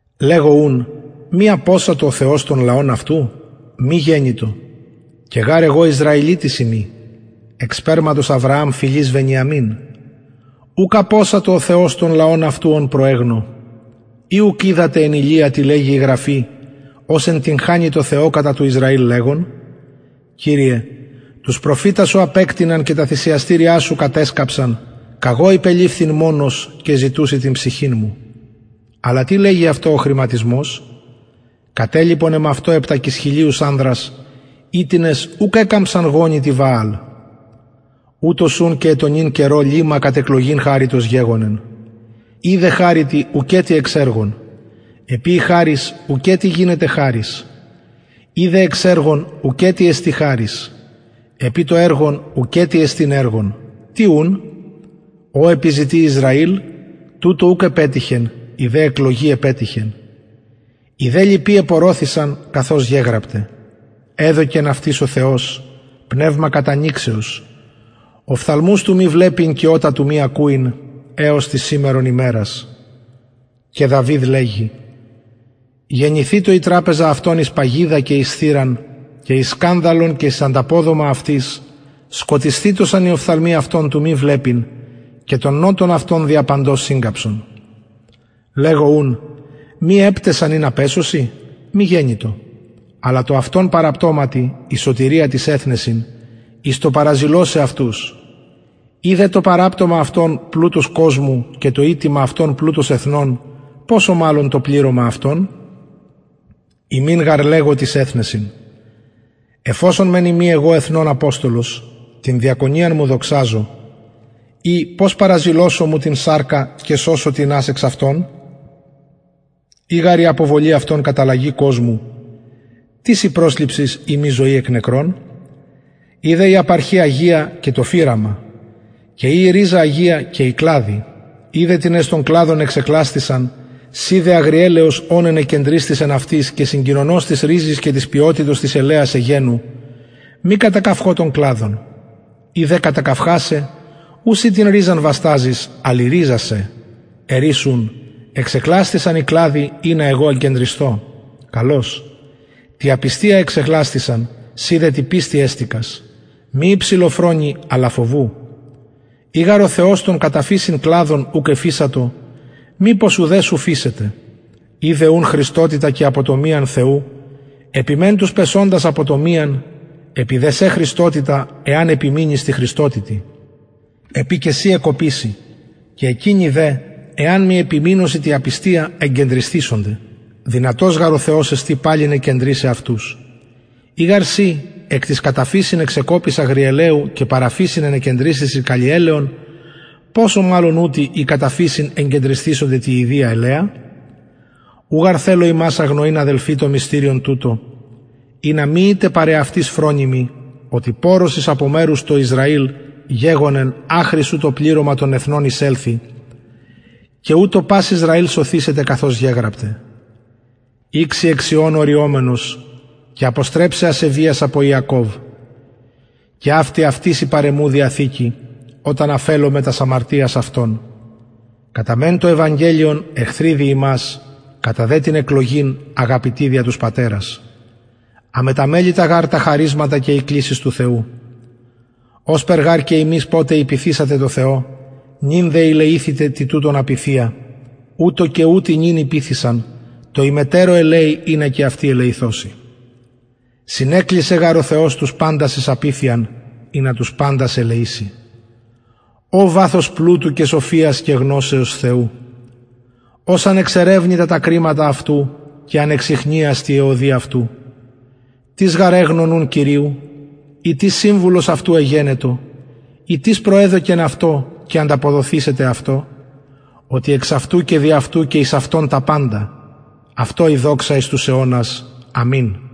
λεγω ουν μη απωσατο ο θεος τον λαον αυτου μη γενοιτο και γαρ εγω ισραηλιτης ειμι εκ σπερματος αβρααμ φυλης βενιαμιν ουκ απωσατο ο θεος τον λαον αυτου ον προεγνω η ουκ οιδατε εν ηλια τι λεγει η γραφη ως εντυγχανει τω θεω κατα του ισραηλ λεγων κυριε τους προφητας σου απεκτειναν και τα θυσιαστηρια σου κατεσκαψαν καγω υπελειφθην μονος και ζητουσιν την ψυχην μου αλλα τι λεγει αυτω ο χρηματισμος κατελιπον εμαυτω επτακισχιλιους ανδρας οιτινες ουκ εκαμψαν γονυ τη βααλ ουτως ουν και εν τω νυν καιρω λειμμα κατ εκλογην χαριτος γεγονεν ει δε χαριτι ουκετι εξ εργων επει η χαρις ουκετι γινεται χαρις ει δε εξ εργων ουκετι εστιν χαρις επει το εργον ουκετι εστιν εργον τι ουν ο επιζητει ισραηλ τουτο ουκ επετυχεν η δε εκλογη επετυχεν οι δε λοιποι επωρωθησαν καθως γεγραπται εδωκεν αυτοις ο θεος πνευμα κατανυξεως οφθαλμους του μη βλεπειν και ωτα του μη ακουειν εως της σημερον ημερας και δαυιδ λεγει γενηθητω η τραπεζα αυτων εις παγιδα και εις θηραν και εις σκανδαλον και εις ανταποδομα αυτοις σκοτισθητωσαν οι οφθαλμοι αυτων του μη βλεπειν και τον νωτον αυτων δια παντος συγκαμψον λεγω ουν μη επταισαν ινα πεσωσιν μη γενοιτο αλλα τω αυτων παραπτωματι η σωτηρια τοις εθνεσιν εις το παραζηλωσαι αυτους ει δε το παραπτωμα αυτων πλουτος κοσμου και το ηττημα αυτων πλουτος εθνων ποσω μαλλον το πληρωμα αυτων υμιν γαρ λεγω τοις εθνεσιν εφ οσον μεν ειμι εγω εθνων αποστολος την διακονιαν μου δοξαζω ει πως παραζηλωσω μου την σαρκα και σωσω τινας εξ αυτων ει γαρ η αποβολη αυτων καταλλαγη κοσμου τις η προσληψις ει μη ζωη εκ νεκρων ει δε η απαρχη αγια και το φυραμα και ει η ριζα αγια και οι κλαδοι ει δε τινες των κλαδων εξεκλασθησαν συ δε αγριελαιος ων ενεκεντρισθης εν αυτοις και συγκοινωνος της ριζης και της πιοτητος της ελαιας εγενου μη κατακαυχω των κλαδων ει δε κατακαυχασαι ου συ την ριζαν βασταζεις αλλ η ριζα σε ερεις ουν εξεκλασθησαν κλαδοι ινα εγω εγκεντρισθω καλως τη απιστια εξεκλασθησαν συ δε τη πιστει εστηκας μη υψηλοφρονει αλλα φοβου ει γαρ ο θεος των κατα φυσιν κλαδων ουκ εφεισατο μηπως ουδε σου φεισεται ιδε ουν χρηστοτητα και αποτομιαν θεου επι μεν τους πεσοντας αποτομιαν επι δε σε χρηστοτητα εαν επιμεινης τη χρηστοτητι επει και συ εκκοπηση και εκεινοι δε εαν μη επιμεινωσιν τη απιστια εγκεντρισθησονται δυνατος γαρ ο θεος εστιν παλιν εγκεντρισαι αυτους ει γαρ συ εκ της κατα φυσιν εξεκοπης αγριελαιου και παρα φυσιν ενεκεντρισθης εις καλλιελαιον ποσω μαλλον ουτοι οι κατα φυσιν εγκεντρισθησονται τη ιδια ελαια ου γαρ θελω υμας αγνοειν αδελφοι το μυστηριον τουτο ινα μη ητε παρ εαυτοις φρονιμοι οτι πωρωσις απο μερους τω ισραηλ γεγονεν αχρι ου το πληρωμα των εθνων εισελθη και ουτως πας ισραηλ σωθησεται καθως γεγραπται ηξει εκ σιων ο ρυομενος και αποστρεψει ασεβειας απο ιακωβ και αυτη αυτοις η παρ εμου διαθηκη οταν αφελωμαι τας αμαρτιας αυτων κατα μεν το ευαγγελιον εχθροι δι υμας κατα δε την εκλογην αγαπητοι δια τους πατερας αμεταμελητα γαρ τα χαρισματα και η κλησις του θεου ωσπερ γαρ και υμεις ποτε ηπειθησατε τω θεω νυν δε ηλεηθητε τη τουτων απειθεια ουτως και ουτοι νυν ηπειθησαν τω υμετερω ελεει ινα και αυτοι ελεηθωσιν συνεκλεισεν γαρ ο θεος τους παντας εις απειθειαν ινα τους παντας ελεηση ω βαθος πλουτου και σοφιας και γνωσεως θεου ως ανεξερευνητα τα κριματα αυτου και ανεξιχνιαστοι αι οδοι αυτου τις γαρ εγνω νουν κυριου η τις συμβουλος αυτου εγενετο η τις προεδωκεν αυτω και ανταποδοθησεται αυτω οτι εξ αυτου και δι αυτου και εις αυτον τα παντα αυτω η δοξα εις τους αιωνας αμην